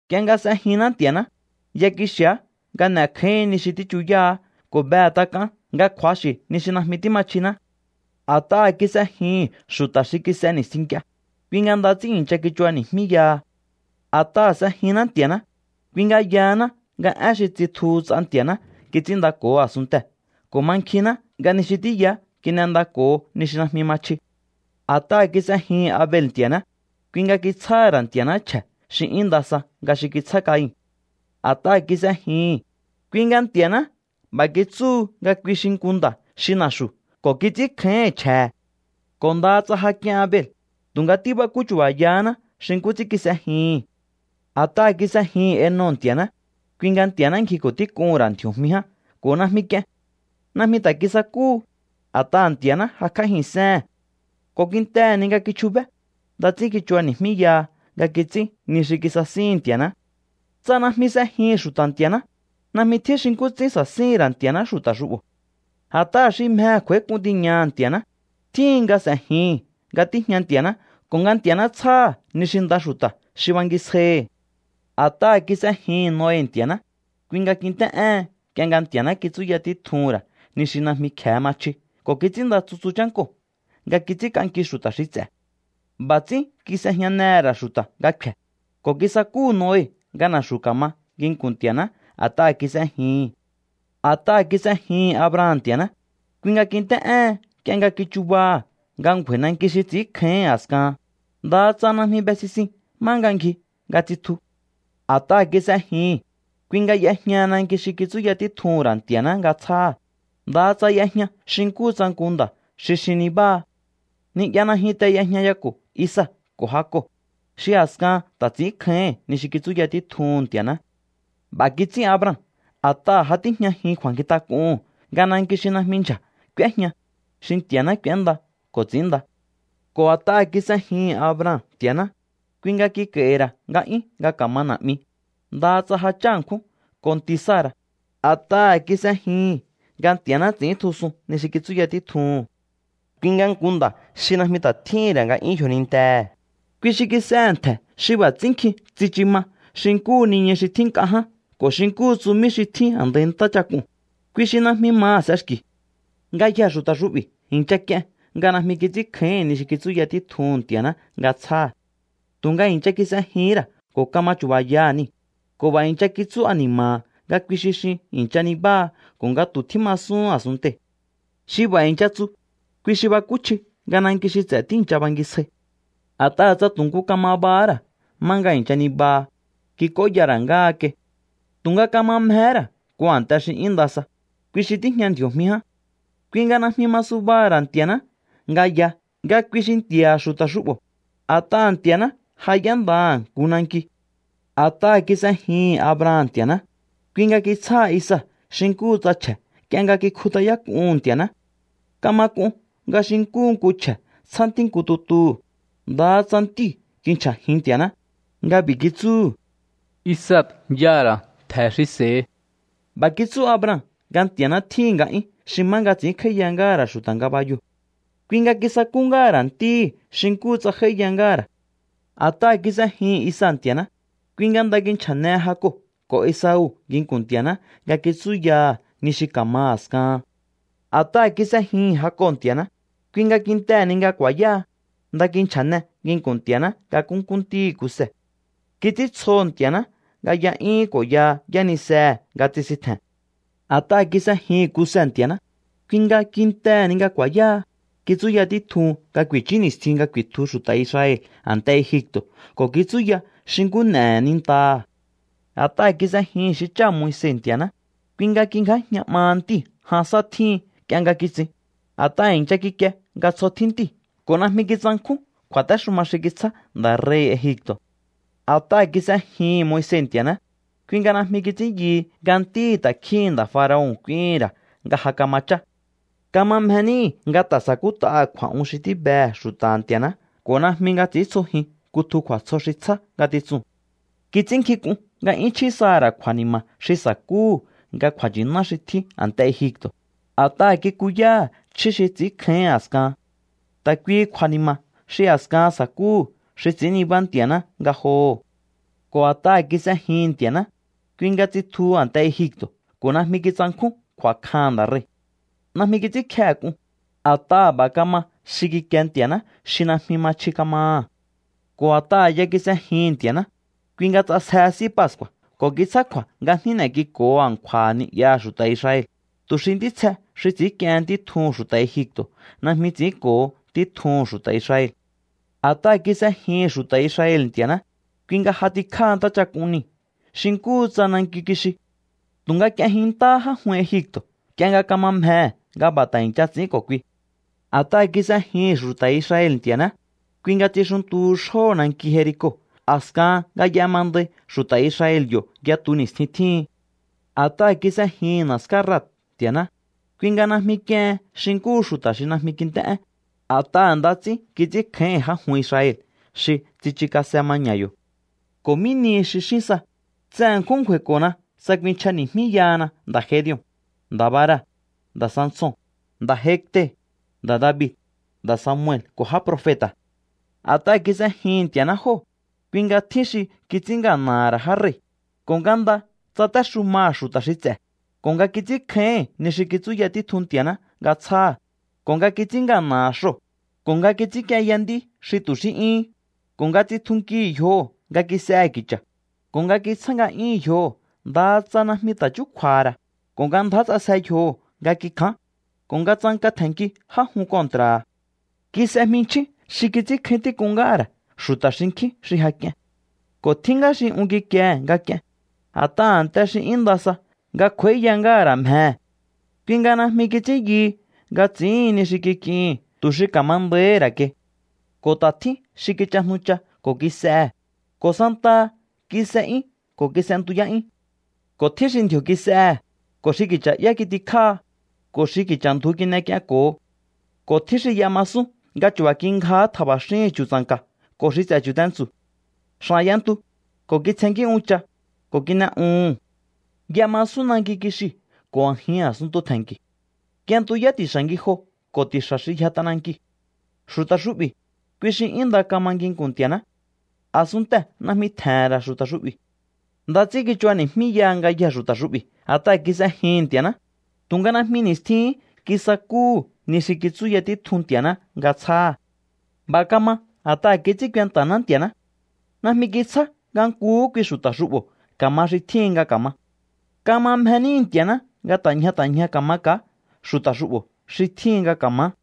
Nk'ie nga s'ejinná Nti̱a̱ná, ya kixi̱á nga n'e̱kjáíhi̱ín ni xi tíchuyáha̱á ko̱ behe̱ tak'aán nga kju̱axi̱ ni xi najmi tíma chjiná. A̱t'aha̱ kis'ejihi̱n xu̱ta̱ xi kis'e ni̱stjin nk'ie, kui nga nda ts'ín i̱ncha kichubani̱jmíyaha. A̱t'aha̱ s'ejinná Nti̱a̱ná, kui nga yahaná nga én xi tsitjuhu ts'a Nti̱a̱ná kits'ínndako̱ho a̱sunntee̱ ko̱ mankjinná nga ni xi tíyaá kin'endako̱ho ni xi najmi ma chji. A̱t'aha̱ kis'ejihi̱n Abel Nti̱a̱ná, kui nga kitsjáha̱ ra̱ Nti̱a̱ná chje̱ xi 'yún nda sa nga xi kitsjá Cain. A̱t'aha̱ kis'ejihi̱n, kui nga Nti̱a̱ná b'a̱ kitsúhu nga kui xi nku nda̱ xi na̱xu̱ ko̱ kits'ínkjáíhi̱n chje̱he̱. Ko̱ ndaha tsa ja k'ien Abel, tu̱nga tíbakú chu̱ba̱yaháná xi nkú ts'ín kis'ejihi̱n. A̱t'aha̱ kis'ejihi̱n Enoc Nti̱a̱ná, kui nga Nti̱a̱ná ngjiko̱ tík'uhu̱n ra̱ ndji̱o̱jmi ján ko̱ najmi k'ien. Najmi ta̱ kisakúhu, a̱t'aha̱ Nti̱a̱ná jakj'ájihi̱nséhe̱n. Ko̱ kintehe̱ ni nga kichjubé, nda ts'ín kichubani̱jmíyaha nga kits'ín ni xi kisasíhi̱n Nti̱a̱ná. Tsa najmi s'ejihi̱n xu̱ta̱ Nti̱a̱ná, najmi tjín xi nkú ts'ín sa̱síhi̱n ra̱ Nti̱a̱ná xu̱ta̱ xu'bo̱. A̱t'aha̱ xi mjehe̱ kj'u̱a̱ík'un tiñaha̱ Nti̱a̱ná, tjíhin nga s'e̱jihi̱n nga tíjña Nti̱a̱ná ko̱ nga Nti̱a̱ná tsjáha̱ ni xi nda xu̱ta̱ xi bangisjaihi̱. A̱t'aha̱ kis'ejihi̱n Noe Nti̱a̱ná, kui nga kint'é'éhen nk'ie nga Nti̱a̱ná kitsúya títjuhu̱n ra̱ ni xi najmi kje̱e ma chji ko̱ kits'ínnda tsutsu chánkoo̱ nga kits'ínk'anki xu̱ta̱ xi ts'e̱. B'a̱ ts'ín kis'ejñanehe̱ ra̱ xu̱ta̱ nga kfe̱, ko̱ kisakúhu̱ Noe nga na̱xu̱ ka̱ma nginku̱n Nti̱a̱ná a̱t'aha̱ kis'ejihi̱n. A̱t'aha̱ kis'ejihi̱n Abraham Nti̱a̱ná, kui nga kint'é'éhen nk'ie nga kichubaha̱ nga ngju̱a̱i̱ nanki xi ts'i̱ínkjáíhi̱n a̱skahan, ndaha tsa najmi be sisin má nga ngji nga tsutju. A̱t'aha̱ kis'ejihi̱n, kui nga y'ejñaha nanki xi kitsúya títjuhu̱n ra̱ Ntia̱ná nga tsjáha̱, ndaha tsa y'ejña xi nkúhu nku nda̱ xi xin nibáha. Ni'ya najyunte y'ejñayako̱ Isaac ko̱ Jacob, xi a̱skahan ta̱ ts'i̱ínkjáíhi̱n ni xi kitsúya títjuhu̱n Nti̱a̱ná. B'a̱ kits'ín Abraham a̱t'aha̱ ja tíjñajin kju̱a̱nkjintak'uhu̱n nga nanki xi najmi ndyja̱ k'úéjña, xi Nti̱a̱ná k'u̱énda ko̱ ts'i̱ínnda. Ko̱ a̱t'aha̱ kis'ejihi̱n Abraham Nti̱a̱ná, kui nga kik'a̱i̱hi̱ ra̱ nga'yún nga ka̱maha na̱'mi, ndaha tsa ja chá ṉkjún ko̱ nti̱ Sara̱, a̱t'aha̱ kis'ejihi̱n nga Nti̱a̱ná ts'i̱íntjusun ni xi kitsúya títjuhu̱n. Kui nga nku nda̱ xi najmi ta̱ tjíhi̱n ra̱ nga'yún yjonintehe̱, kui xi kis'ehe̱ ntje̱ xi b'a̱ ts'ín nkjin tsichu ma xi nkúhu niñu xi tjín nk'a ján ko̱ xi nkúhu tsumí xi tjín a̱ndai ntáchak'uu̱n, kui xi najmi maha̱ s'exki̱. Ngayjee̱ xu̱ta̱ xu'bi̱ i̱ncha k'ien nga najmi kits'ínkjáíhi̱n ni xi kitsúya títjuhu̱n Nti̱a̱ná nga tsjáha̱. Tu̱nga i̱ncha kis'ejihín ra̱ ko̱ kama chu̱ba̱yaha̱ niu̱, ko̱ b'a̱ i̱ncha kitsú ani̱ma̱ha̱ nga kui xi xin i̱ncha nibáha ko̱ nga tu̱ tjímasúhún a̱sunntei̱. Xi b'a̱ i̱ncha tsu, kui xi bakúchji nga nanki xi ts'e̱ tíi̱ncha bangisjai. A̱t'aha̱ tsa tu̱ nku kama bahá ra̱ má nga i̱ncha nibaha, kik'óya ra̱ ngáha kai. Tu̱nga kama mjehé ra̱ nku a̱nte xi 'yún nda sa, kui xi tíjña ndji̱o̱jmi ján. Kui nga najmi ma subaha̱ ra̱ Nti̱a̱ná nga ya nga kui xi Nti̱a̱ha̱ xu̱ta̱ xu'bo̱, a̱t'aha̱ Nti̱a̱ná ja y'éndaha̱ nku nanki. A̱t'aha̱ kis'ejihi̱n Abraham Nti̱a̱ná, kui nga kitsjáha Isaac xi nkúhu tsa chje̱ nk'ie nga kikjut'ayák'uhu̱n Nti̱a̱ná. Kama k'un nga xi nkúhu nku chje̱ tsjá ntí nku tutuhu̱, ndaha tsa ntíu̱ kinchja̱jin Nti̱a̱ná nga b'i̱ kitsúhu̱: “Isaac y'aha̱ ra̱ ntje̱ xi s'e̱hi.” B'a̱ kitsú Abraham nga Nti̱a̱ná tjíhi̱n nga'yún xi má nga ts'ínkj'áíya ngáha̱ ra̱ xu̱ta̱ ngabayoo̱. Kui nga kisakú ngáha̱ ra̱ ntíhi̱ xi nkúhu tsa j'áíya ngáha̱ ra̱. A̱t'aha̱ kis'ejihi̱n Isaac Nti̱a̱ná, kui nga nda kinchja̱nehe Jacob ko̱ Esau nginku̱n Nti̱a̱ná nga kitsúyaha̱ ni xi ka̱ma a̱skahan. A̱t'aha̱ kis'ejihi̱n Jacob Nti̱a̱ná, kui nga kintehe̱ ni nga ku̱a̱yáha, nda kinchja̱ne nginku̱n Nti̱a̱ná nga nkúnkú ntíhi̱ Kuse. Kits'íntsjoho̱ Nti̱a̱ná nga y'a'yúhún ko̱ ya yánisehe̱ nga tsisintje̱n. A̱t'aha̱ kis'ejihi̱n Kuse Nti̱a̱ná, kui nga kintehe̱ ni nga ku̱a̱yáha, kitsúya títjun nga ku̱i̱chú ni̱stjin nga ku̱i̱tju xu̱ta̱ Israel a̱nte Egipto̱ ko̱ kitsúya xi nkú n'e̱he̱ nintaha̱. A̱t'aha̱ kis'ejihi̱n xi cháha̱ Moise Nti̱a̱ná, kui nga kingjájña 'maha ntíu̱ jan sá tjíhin nk'ie nga kitsin, a̱t'aha̱ i̱ncha kikie nga tsjo tjín ntíu̱ ko̱ najmi kitsankjún kju̱a̱téxuma xi kitsjá nda̱ rei̱hi̱ Egipto̱. A̱t'aha̱ kis'ejihi̱n Moise Nti̱a̱ná, kui nga najmi kits'ín yuhu nga ntíhi̱ ta̱kjíhi̱n nda̱ faraon k'úíhi̱n ra̱ nga ja kama chá. Kama mje níhi̱ nga ta̱ sa̱kút'aha̱ kju̱a̱'un xi tíbehe̱ xu̱ta̱ha̱ Nti̱a̱ná ko̱ najmi nga ts'i̱íntsjojin kutju kju̱a̱tsjo xi tsjá ngatitsuu̱n. Kits'ínnkjink'un nga 'yún chjí saha̱ ra̱ kju̱a̱ni̱ma̱ xi sa̱kúhu̱ nga kju̱a̱nchi̱ná xi tjín a̱nte Egipto̱, a̱t'aha̱ kikuyáha̱ chjí xi ts'i̱ínkjáíhi̱n a̱skahan. Ta̱ kuihi kju̱a̱ni̱ma̱ xi a̱kahan sa̱kúhu̱ xi ts'i̱ín nibá Nti̱a̱ná ngajoho̱. Ko̱ a̱t'aha̱ kis'ejihi̱n Nti̱a̱ná, kui nga tsitjuhu a̱nte Egipto̱ ko̱ najmi kitsankjún kju̱a̱kjaha̱n nda̱ rei̱. Najmi kits'ínkjehe̱ k'un, a̱t'aha̱ b'a̱ kama xi kikie Nti̱a̱ná xi najmi ma chji kamaha̱. Ko̱ a̱t'aha̱ ya kis'ejihi̱n Nti̱a̱ná, kui nga ts'asjehe S'í Pascu̱a̱ ko̱ kitsjákju̱a̱ nga jní n'e̱k'iko̱ho a̱nkju̱a̱ha̱ ni'yaha̱ xu̱ta̱ Israel, tu̱ xi ntítsje xi ts'i̱ínk'iehen ntí tjuhu̱n xu̱ta̱ Egipto̱ najmi ts'i̱ínko̱ho ntí tjuhu̱n xu̱ta̱ Israel. A̱t'aha̱ kis'ejihi̱n xu̱ta̱ Israel Nti̱a̱ná, kui nga j'atikjáha Ntáchak'un Niu̱ xi nkúhu tsa nanki kixi. Tu̱nga k'ienjinntáhá já jun Egipto̱ nk'ie nga kama mjehe̱ nga b'a̱ ta̱ i̱ncha ts'i̱ín ko̱ kui. A̱t'aha̱ kis'ejihi̱n xu̱ta̱ Israel Nti̱a̱ná, kui nga tsixuntuhu xjóho̱ nanki Jerico a̱skahan nga y'emandai xu̱ta̱ Israel yo̱ yatu ni̱stjin tjíhin. A̱t'aha̱ kis'ejihi̱n na̱ská Rahab Nti̱a̱ná, kui nga najmi k'iehen xi nkúhu xu̱ta̱ xi najmi kint'é'én, a̱t'aha̱ nda ts'ín kits'ínkjáíhi̱n já jun Israel xi tsichukase maña̱ yo̱. ¿Ko̱ mí nihi xi xín sa? Tse ṉkjún ngju̱a̱i̱ko̱na tsa kuinchjani̱jmíyahana nda̱ Gedeon, nda̱ Barak, nda̱ Sanson, nda̱ Jefte, nda̱ David, nda̱ Samuel ko̱ já profeta̱. A̱t'aha̱ kis'ejihi̱n Nti̱a̱ná jóo̱, kui nga tjín xi kits'ín ngana̱ha̱ ra̱ já rei̱, ko̱ nga nda tsatéxumaha̱ xu̱ta̱ xi ts'e̱, ko̱ nga kits'ínkjáíhi̱n ni xi kitsúya títjun Nti̱a̱ná nga tsjáha̱, ko̱ nga kits'ín ngana̱ha̱ xoo̱, ko̱ nga kits'ínk'ienya nd'í xi tu̱ xí 'yúhún, ko̱ nga tsitjunkihi̱ yjoho̱ nga kis'ehe̱ ki̱cha̱, ko̱ nga kitsjá nga'yúhu̱n yjoho̱ ndaha tsa najmi ta̱ chúkju̱a̱ha̱ ra̱, ko̱ nga ndjá ts'asje yjoho̱ nga kikján, ko̱ nga tsanka tje̱nnki já jun kontra̱ha̱. Kis'e jminchjín xi kits'ínkjáín tík'un ngáha̱ ra̱ xu̱ta̱ xinkjín xi ja k'ien. Ko̱ tjín ngá xi un kikiehe̱ nga k'ien, a̱t'aha̱ a̱nte xi 'yún nda sa nga kj'u̱a̱íya ngáha̱ ra̱ mjehe̱. Kui nga najmi kits'ín yuhu nga ts'i̱íhin ni xi kik'ihi̱n tu̱ xi ka̱ma nda̱íhi̱ ra̱ kai. Ko̱ ta̱ tjín xi kichajnucha ko̱ kis'ehe̱, ko̱ santaha kis'e'yún ko̱ kis'entuyá'yún. Ko̱ tjín xi ndji̱o̱ kis'ehe̱, ko̱ xi ki̱cha̱'yá kitikjáha, ko̱ xi ki̱cha̱ ndju kin'ek'ienko̱ho. Ko̱ tjín xi y'emasún nga chu̱ba̱ kingjahá tja̱ba̱xíhi̱n chu̱tsa̱nka̱ ko̱ xi ts'e̱ chu̱tentsu̱. X'a̱n y'entu, ko̱ kitsjennkí uncha, ko̱ kin'e'uhu̱n. Y'emasún nanki kixiu̱ ko̱ a̱jin a̱sunntu tje̱nki̱. Y'entuyá ti̱xa̱ ngijoo̱ ko̱ ti̱xa̱ xi yja t'anankiu̱. Xu̱ta̱ xu'bi̱, kui xi 'yún nda kama nginku̱n Nti̱a̱ná. A̱sunntee̱ najmi tje̱he̱n ra̱ xu̱ta̱ xu'bi̱. Nda ts'ín kichubani̱jmíyaha ngayjee̱ xu̱ta̱ xu'bi̱ a̱t'aha̱ kis'ejihi̱n Nti̱a̱ná, tu̱nga najmi ni̱stjihín kisakúhu̱ ni xi kitsúya títjun Nti̱a̱ná nga tsjáha̱. B'a̱ kama a̱t'aha̱ kits'ín kuenta̱ná Nti̱a̱ná. Najmi kitsjá nga nkuhú kui xu̱ta̱ xu'bo̱ ka̱ma xi tjíhin nga ka̱ma. Kama mje níhi̱ Nti̱a̱ná nga ta̱ ñja ta̱ ñja ka̱maka̱á xu̱ta̱ xu'bo̱ xi tjíhin nga ka̱maá.